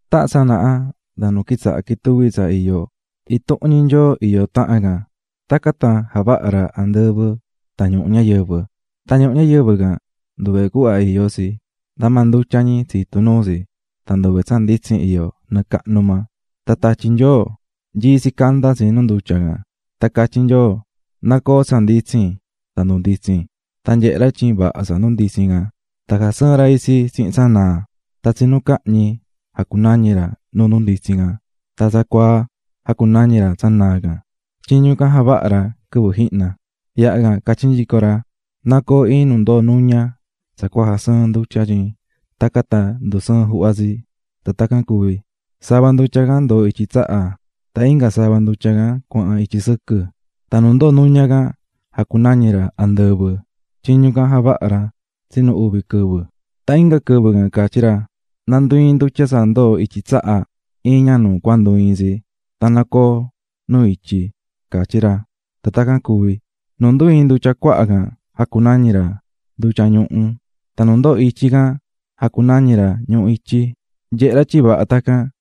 Tahan tsanaha nda nu quitsaha̱ quituví tsa iyó, intuhun ñi Nyoo iyó. Tacan tan javaha̱ ra andɨvɨ tan ñuhu ñayɨvɨ. Tan ñuhu ñayɨvɨ can nduve cuhva iyó tsi, nda maa ndutya ñi tsitu̱ nuu tsi tan nduve tsa nditsin iyó. Tan tatyi Nyoo nyií tsi candá tsi nu ndutya. Tan catyí Nyoo: "¡Na coo tsa nditsin!" Tan ndunditsi̱n. Tan nyehe̱ ra tyin vaha tsa nditsin can. Tan jasɨɨ̱n ra tsa nditsin can tan tsa naa can. Tan "tsinu cahñi" jacunañi̱ ra tsa nditsin can tan "tsacuaa" jacunañi̱ ra tsa naa can. Tyiñu can javaha̱ ra quɨvɨ jihna. Yaha can catyí nyico ra: "Na coo iin nu ndoo nuña tsa cua jasɨɨn ndutya tyin tacan tan cuvi ndusɨɨn juhva tsi." Tan tacan cuvi̱. Sava ndutya can ndoo̱ ityi tsaha tan inga sava ndutya can cuahan ityi sɨquɨ tan nu ndoo̱ nuña can jacunañi̱ ra "andɨvɨ". Tyiñu can javaha̱ ra tsinu uvi quɨvɨ. Tan inga quɨvɨ can catyí ra: "Na ndu iin ndutya tsa ndoo̱ ityi tsaha iin ña nu cua ndu iin tsi tan na coo nu ityi", catyí ra. Tan tacan cuvi̱. Nu ndu ii̱n ndutya cuaha can jacunañi̱ ra "ndutya ñuhu", tan nu ndoo̱ ityi can jacunañi̱ ra "ñuhu ityi". Nyehe̱ ra tyin vaha tacan.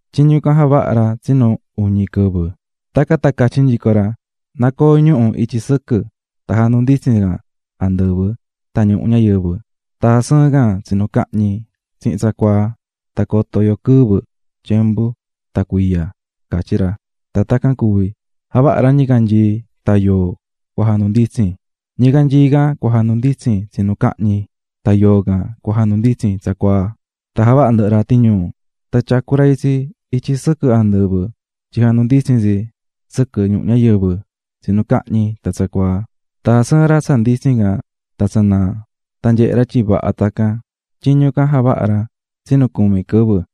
Tyiñu can javaha̱ ra tsinu uñi quɨvɨ. Tacan tan catyí ra: "Na coo ñuhu̱ ityi sɨquɨ tan jandunditsin can andɨvɨ tan nu ñuhu ñayɨvɨ tan jasɨɨn can tsa tsinu cahñi tsihin tsacuaa tan cua coto yo quɨvɨ, tyembu tan cuiya", catyí ra. Tan tacan cuvi̱. Javaha̱ ra ñicanyii tan yoo cua jandunditsin. Ñicanyii cua jandunditsin tsinu cahñi, tan yoo cua jandunditsin tsacuaa, tan javaha̱ ndɨhɨ ra tiñuu. Tan tyacu̱ ra itsi ityi sɨquɨ andɨvɨ tyin jandunditsin tsi sɨquɨ ñuhu ñayɨvɨ tsinu cahñi tan tsacuaa. Tan jasɨɨ̱n ra tsa nditsin can tan tsa naa. Tan nyehe̱ ra tyin vaha tacan. Tyiñu can javaha̱ ra tsinu cumi quɨvɨ.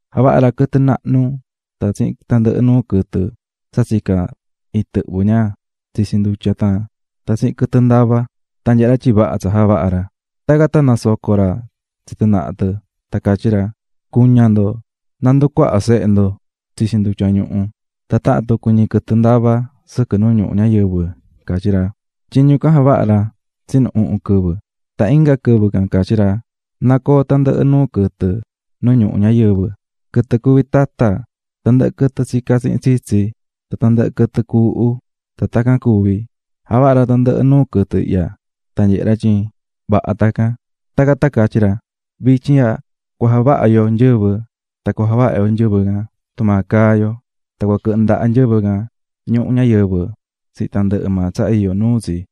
Javaha̱ ra quɨtɨ nahnu tan tsihin tandɨhɨ nuu quɨtɨ tsa tsicá intɨhvɨ ña tsitsi ndutya tan tsihin quɨtɨ ndavá. Tan nyehe̱ ra tyin vaha tsa javaha̱ ra. Tacan tan nasoco̱ ra tsi tɨ naha tɨ, tan catyí ra: "Cu̱ña ndo, na nducuaha sehe ndo tsitsi ndutya ñuhu, tan tahan tucu ñi quɨtɨ ndavá sɨquɨ nu ñuhu ñayɨvɨ", catyí ra. Tyiñu can javaha̱ ra tsinu uhun quɨvɨ. Tan inga quɨvɨ can catyí ra: "Na coo tandɨhɨ nuu quɨtɨ nu ñuhu ñayɨvɨ: quɨtɨ cuví tata, tandɨhɨ quɨtɨ tsicá tsihin tsitsi, tan tandɨhɨ quɨtɨ cuuhu." Tan tacan cuvi̱. Javaha̱ ra tandɨhɨ nuu quɨtɨ ihya. Tan nyehe̱ ra tyin vaha tacan. Tacan tan catyí ra: "Vityin ihya cua javaha yo iin nyɨvɨf1 tan cua javaha yo itsi tumaa caá maa yo. Tan cua quɨhɨ ndaha nyɨvɨ ihya ñuhu ñayɨvɨ tsihin tandɨhɨ maa tsa iyó nuu tsi."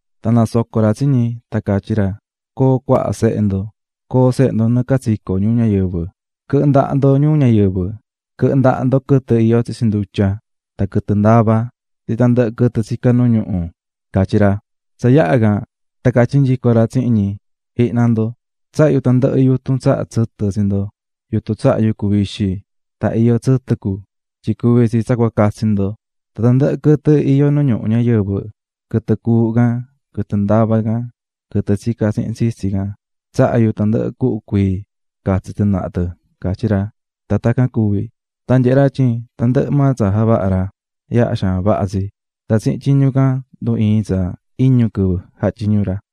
Tan nasoco̱ ra tsi ñi, tan catyí ra: "Co̱o cuaha sehe ndo, co̱o sehe ndo nɨɨ catsico ñuu ñayɨvɨ. quɨ̱hɨ ndaha ndo ñuu ñayɨvɨ, quɨ̱hɨ ndaha ndo quɨtɨ iyó tsitsi ndutya, tan quɨtɨ ndavá, tsihin tandɨhɨ quɨtɨ tsicá nu ñuhu", catyí ra. Tsa yaha̱ can tan catyí nyico ra tsihin ñi: "Ji̱hna ndo, tsahá yu tandɨhɨ yutun tsahá tsɨtɨ tsi ndo: yutun tsahá yucu vixi tan iyó tsɨtɨ cu, tandɨhɨ tsehe cuví catsi ndo. Tan tandɨhɨ quɨtɨ iyó nu ñuhu ñayɨvɨ: quɨtɨ cuuhu can, quɨtɨ ndavá can, quɨtɨ tsicá tsihin tsitsi can, tsahá yu tandɨhɨ cuhu cuii catsi tɨ naha tɨ", catyí ra. Tan tacan cuvi̱. Tan nyehe̱ ra tyin tandɨhɨ maa tsa javaha̱ ra yaha xaan vaha tsi, tan tsihin tyiñu ican ndu ii̱n tsa iñu quɨvɨ jatyiñu̱ ra.